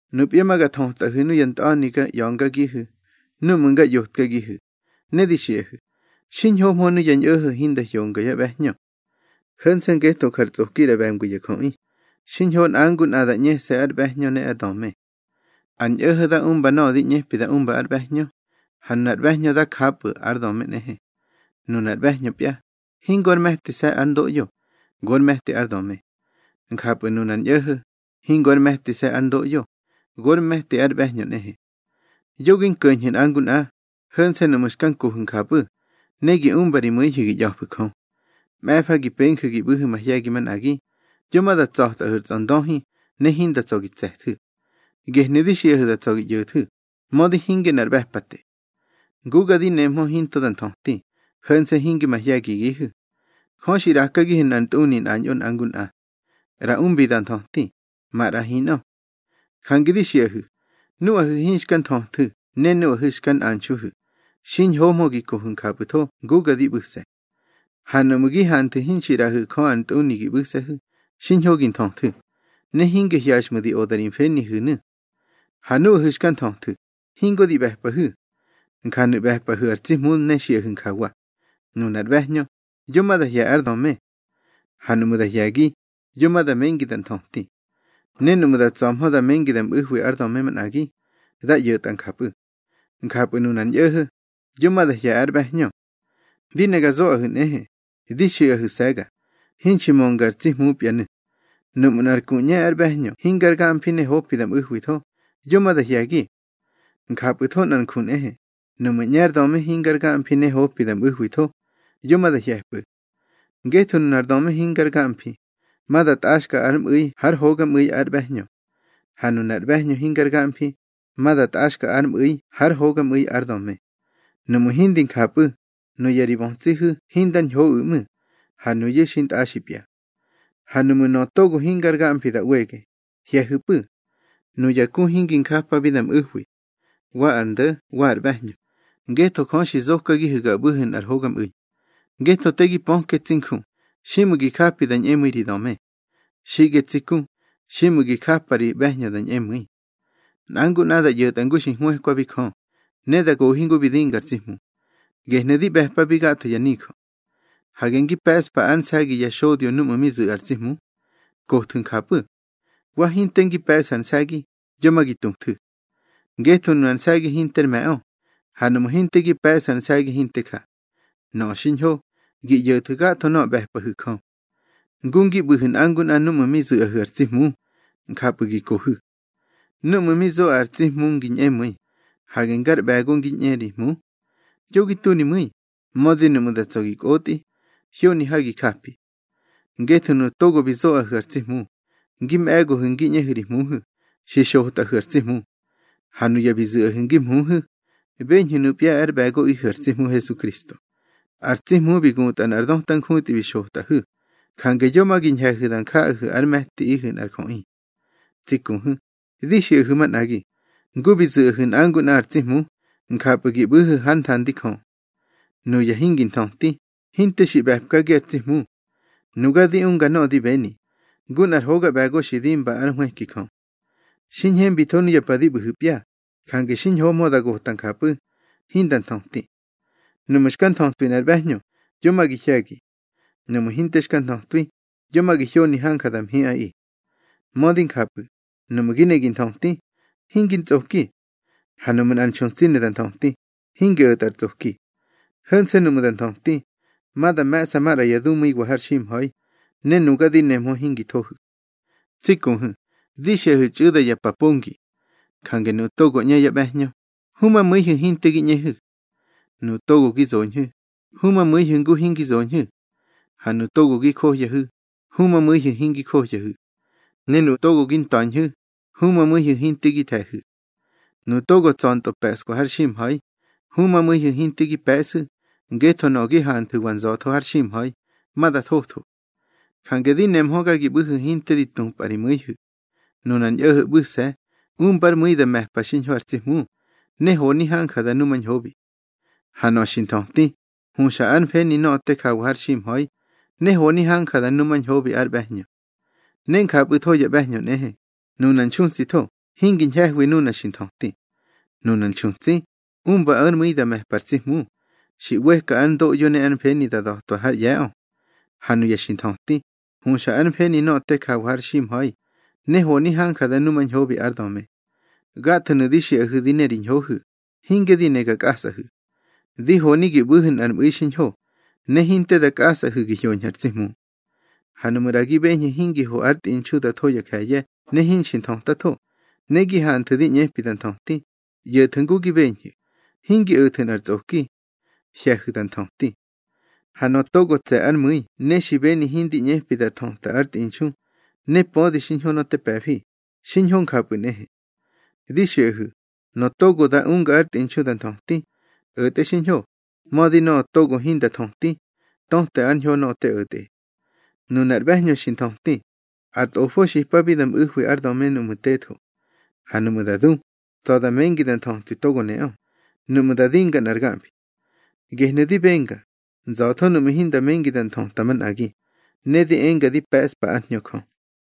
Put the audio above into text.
Nupya ma ga thötꞌaꞌihu̱ nuya ntꞌa̱ni ga ꞌya̱ngagihu̱ núꞌmu̱ nga ꞌyotkagihu̱, ne di xiꞌahu̱: Xiñhohmö nuya ñꞌo̱ho̱ hinda hyongyá ꞌbe̱hñö. Ho̱nse̱ ngetho jar tsꞌoki ꞌra ꞌbe̱ngwi ya jöꞌi, xiñho nꞌa ngu nꞌa da ꞌñese̱ ár ꞌbe̱hñö ne ár döme. Ar ñꞌo̱ho̱ da umba nöꞌö di ꞌñepi da umba ár ꞌbe̱hñö, ha nunar ꞌbe̱hñö dá japꞌu̱ ár döme nꞌehe. Nunar ꞌbe̱hñöpya, hingo ár me̱tise̱ ár ndoꞌyo, gor me̱ti ár döme. Njapꞌu̱ nunar ñꞌo̱ho̱, hingo ár me̱tise̱ ár ndoꞌyo, gor me̱ti ár ꞌbe̱hñö nꞌehe. Yo gi nko̱ñhu̱ nꞌa ngu nꞌa, ho̱nse̱ nuꞌmu̱ xka nkohu̱ njapꞌu̱ ne gi umba ri mu̱ihu̱ gi ꞌya̱fu̱ Jö. Mꞌe̱fa gi penju̱ gi ꞌbu̱hu̱ mahye̱gi manꞌagi, yo ma da tsa̱tꞌahu̱ ar tsꞌondöhi ne hinda tsa̱ gi tse̱thu̱. Gehnu̱ di xiꞌahu̱ da tsa̱ gi ꞌyo̱thu̱, mödi hinge nꞌar ꞌbe̱pate. Nguga di nemhö hinto da nthöti, ho̱nse̱ hinge mahye̱gigihu̱. Jö xi ꞌrakagihu̱ nꞌar ntꞌuni nꞌañꞌo nꞌa ngu nꞌa. ꞌRa umbi da nthöti, maꞌra hinꞌö. Jange di xiꞌahu̱, nuꞌahu̱ hinxka nthöthu̱ ne nuꞌahu̱ xka nꞌanxuhu̱, xiñhohmö gi kohu̱ njapꞌu̱tho nguga di ꞌbu̱se̱. Ha nuꞌmu̱ gi hanthu̱ hinxi ꞌraꞌahu̱ Jö ar ntꞌuni gi ꞌbu̱se̱hu̱, xiñho gi nthöthu̱, ne hinge hyaxꞌmu̱ di oda ri mfenihu̱nu̱. Ha núꞌahu̱ xka nthöthu̱, hingo di ꞌbe̱pꞌahu̱. Njanu̱ ꞌbe̱pꞌahu̱ ar tsi Hmu ne xiꞌahu̱ njawa: Nunar ꞌbe̱hñö, yo ma da hye̱ ár döme. Ha nuꞌmu̱ da hye̱gi, yo ma da mengi da nthöti. Ne nuꞌmu̱ da tsa̱hmö da mengi da mꞌu̱hwi ár döme manꞌagi, dá ꞌyo̱tꞌa njapꞌu̱. Njapꞌu̱ nunar ñꞌo̱ho̱, yo ma da hye̱ ár ꞌbe̱hñö. Di ne ga zoꞌahu̱ nꞌehe, di xiꞌahu̱se̱ga, hinxi mönga ar tsi Hmupyanu̱. Nuꞌmu̱ nꞌar ku ꞌñe ár ꞌbe̱hñö hingar gamfi ne hopi da mꞌu̱hwitho, yo ma da hye̱gi. Njapꞌu̱tho nꞌar nju nꞌehe, nuꞌmu̱ ꞌñe ár döme hingar gamfi ne hopi da mꞌu̱hwitho, yo ma da hye̱pꞌu̱. Ngetho nunar döme hingar gamfi, ma da tꞌaxka ár mꞌu̱i hár hogamꞌu̱i ár ꞌbe̱hñö. Ha nunar ꞌbe̱hñö hingar gamfi, ma da tꞌaxka ár mꞌu̱i hár hogamꞌu̱i ár döme. Nuꞌmu̱ hindi njapꞌu̱, nuya ri bötsihu̱ hindar ñhoꞌu̱ ꞌmu̱, ha nuyu̱ xintꞌaxipya. Ha nuꞌmu̱ nöꞌö togo hingar gamfi da ꞌwege, hye̱hu̱pꞌu̱. Nuya ku hingi njapabi da mꞌu̱hwi, wa ar ndo̱ wa ar ꞌbe̱hñö, ngetho Jö xi zokagihu̱ ga ꞌbu̱hu̱ nꞌar hogamꞌu̱i. Ngetho te gi pöke tsi nju, xiꞌmu̱ gi japi da ñꞌemu̱i ri döme. Xiꞌge tsi ku, xiꞌmu̱ gi japa ri ꞌbe̱hñö da ñꞌemu̱i. Nꞌa ngu nꞌa da ꞌyo̱tꞌa ngu xi hwëkwabi Jö, ne da gohi ngu bi dinga ar tsi Hmu. Gehnu̱ di ꞌbe̱pabi gatho ya nijö. Hage ngi pe̱ꞌspa ár nse̱gi ya xodyo núꞌmu̱ mi zu̱ꞌa ar tsi Hmu. Kothu̱ njapꞌu̱. Wa hinte ngi pe̱ꞌsu̱ ar nse̱gi, yo ma gi tuthu̱. Ngetho nunar nse̱gi hinter me̱ꞌö, ha nuꞌmu̱ hinte gi pe̱ꞌsu̱ ar nse̱gi hinte ja. Nöꞌö xiñho, gi ꞌyo̱thu̱ gatho nöꞌö ꞌbe̱pꞌahu̱ Jö. Ngu ngi ꞌbu̱hu̱ nꞌa ngu nꞌa núꞌmu̱ mi zu̱ꞌahu̱ ar tsi Hmu, njapꞌu̱ gi kohu̱. Núꞌmu̱ mi zoꞌa ar tsi Hmu ngi ñꞌemu̱i, hage ngar ꞌbe̱go ngi ꞌñe ri hmu. Yo gi tu ri mu̱i, mödi nuꞌmu̱ da tsa̱ gi kꞌotꞌi, hyoni ha gi japi. Ngetho nuꞌu̱ togo bi zoꞌahu̱ ar tsi Hmu, ngi mꞌe̱gohu̱ ngi ꞌñehu̱ ri hmuhu̱, xi xotꞌahu̱ ar tsi Hmu. Ha nuya bi zu̱ꞌahu̱ ngi mhuhu̱, beñhu̱ nupya ár ꞌbe̱goꞌihu̱ ar tsi Hmu Hesukristo. Ar tsi Hmu bi gutꞌa nꞌar döta njutꞌi bi xotꞌahu̱, jange yo ma gi ñhe̱hu̱ da njaꞌahu̱ ár me̱ti nꞌar jöꞌi. Tsi kuhu̱, di xiꞌahu̱ manꞌagi, ngu bi zu̱ꞌahu̱ nꞌa ngu nꞌa ar tsi Hmu, njapꞌu̱ gi ꞌbu̱hu̱ hár nthandi Jö. Nuya hingi nthöti, hinte xi ꞌbe̱pkagi ar tsi Hmu. Nuga di unga nöꞌö di beni, ngu nꞌar hoga ꞌbe̱go xi dimba ár nhwëki Jö. Xi ñhembitho nuya pa di ꞌbu̱hu̱pya, jange xiñhohmö da gota njapꞌu̱, hinda nthöti. Nuꞌmu̱ xka nthötwi nꞌar ꞌbe̱hñö, yo ma gi hye̱gi. Nuꞌmu̱ hinte xka nthötwi, yo ma gi hyoni hanja da mhiꞌaꞌi. Mödi njapꞌu̱, nuꞌmu̱ gi ne gi nthöti, hingi ntsꞌoki. Ha nuꞌmu̱ nꞌar nxutsi ne da nthöti, hingi o̱tꞌa ar tsꞌoki. Ho̱nse̱ nuꞌmu̱ da nthöti, ma da me̱ꞌsa maꞌra ya dumu̱iwa har ximha̱i, ne nuga di nemhö hingi thohu̱. Tsi kuhu̱, di xiꞌahu̱ txꞌu̱da ya pa pongi. Jange nuꞌu̱ togo ꞌñe yá ꞌbe̱hñö, humamu̱ihu̱ hinte gi ꞌñehu̱. Nuꞌu̱ togo gi zoñhu̱, humamu̱ihu̱ ngu hingi zoñhu̱. Ha nuꞌu̱ togo gi johyahu̱, humamu̱ihu̱ hingi johyahu̱. Ne nuꞌu̱ togo gi nta̱ñhu̱, humamu̱ihu̱ hinte gi the̱hu̱. Nuꞌu̱ togo tsa̱ntꞌö pe̱ꞌskwa har ximha̱i, humamu̱ihu̱ hinte gi pe̱ꞌsu̱, ngetho nöꞌö gi hanthu̱wa nza̱tho har ximha̱i, ma da thotho. Jange di nemhöga gi ꞌbu̱hu̱ hinte di tupꞌa ri mu̱ihu̱. Nunar ñꞌo̱ho̱ ꞌbu̱se̱, umba ár mu̱i da me̱pa xiñho ar tsi Hmu, ne honi hanja da numañhobi. Ha nöꞌö xi nthöti, huxa ár mfeni nöꞌö te jawa har ximha̱i, ne honi hanja da numañhobi ár ꞌbe̱hñö. Ne njapꞌu̱tho ya ꞌbe̱hñö nꞌehe, nuna nxutsitho hingi ñhe̱hwi nuna xi nthöti. Nunar nxutsi, umba ár mu̱i da me̱pa ar tsi Hmu, xi ꞌweka ár ndoꞌyo ne ár mfeni da da̱twa hár ꞌye̱ꞌö. Ha nuya xi nthöti, huxa ár mfeni nöꞌö te jawa har ximha̱i, ne honi hanja da numañhobi ár döme. Gathonu̱ di xiꞌahu̱ di ne ri ñhohu̱, hinge di ne ga kꞌasꞌahu̱. Di honi gi ꞌbu̱hu̱ nꞌar mꞌu̱i xiñho, ne hinte da kꞌasꞌahu̱ gi hyoñhu̱ ar tsi Hmu. Ha nuꞌmu̱ ꞌra gi beñhu̱ hingi ho ár tꞌinxu da tho ya je̱ye̱ ne hinxi nthötatho, ne gi hanthu̱ di ꞌñepi da nthöti, ꞌyo̱thu̱ ngu gi beñhu̱, hingi o̱thu̱ nꞌar tsꞌoki. Hye̱hu̱ da nthöti. Ha nöꞌö togo tse̱ ár mu̱i ne xi beni hindi ꞌñepi da thöta ár tꞌinxu, ne pödi xiñho nöꞌö te pe̱fi, xiñho njapꞌu̱ nꞌehe. Di xiꞌahu̱, nöꞌö togo da unga ár tꞌinxu da nthöti, o̱tꞌe xiñho, mödi nöꞌö togo hinda thöti, töte ár ñho nöꞌö te o̱tꞌe. Nunar ꞌbe̱hñö xi nthöti, ar tꞌofo xipabi da mꞌu̱hwi ár döme núꞌmu̱ tetho. Ha nuꞌmu̱ da du, tsa̱ da mengi da nthötwi togo neꞌö, nuꞌmu̱ da dinga nꞌar gamfi. Gehnu̱ di benga, nza̱tho nuꞌmu̱ hinda mengi da nthöta manꞌagi, ne di enga di pe̱ꞌspa ár Hñö Jö.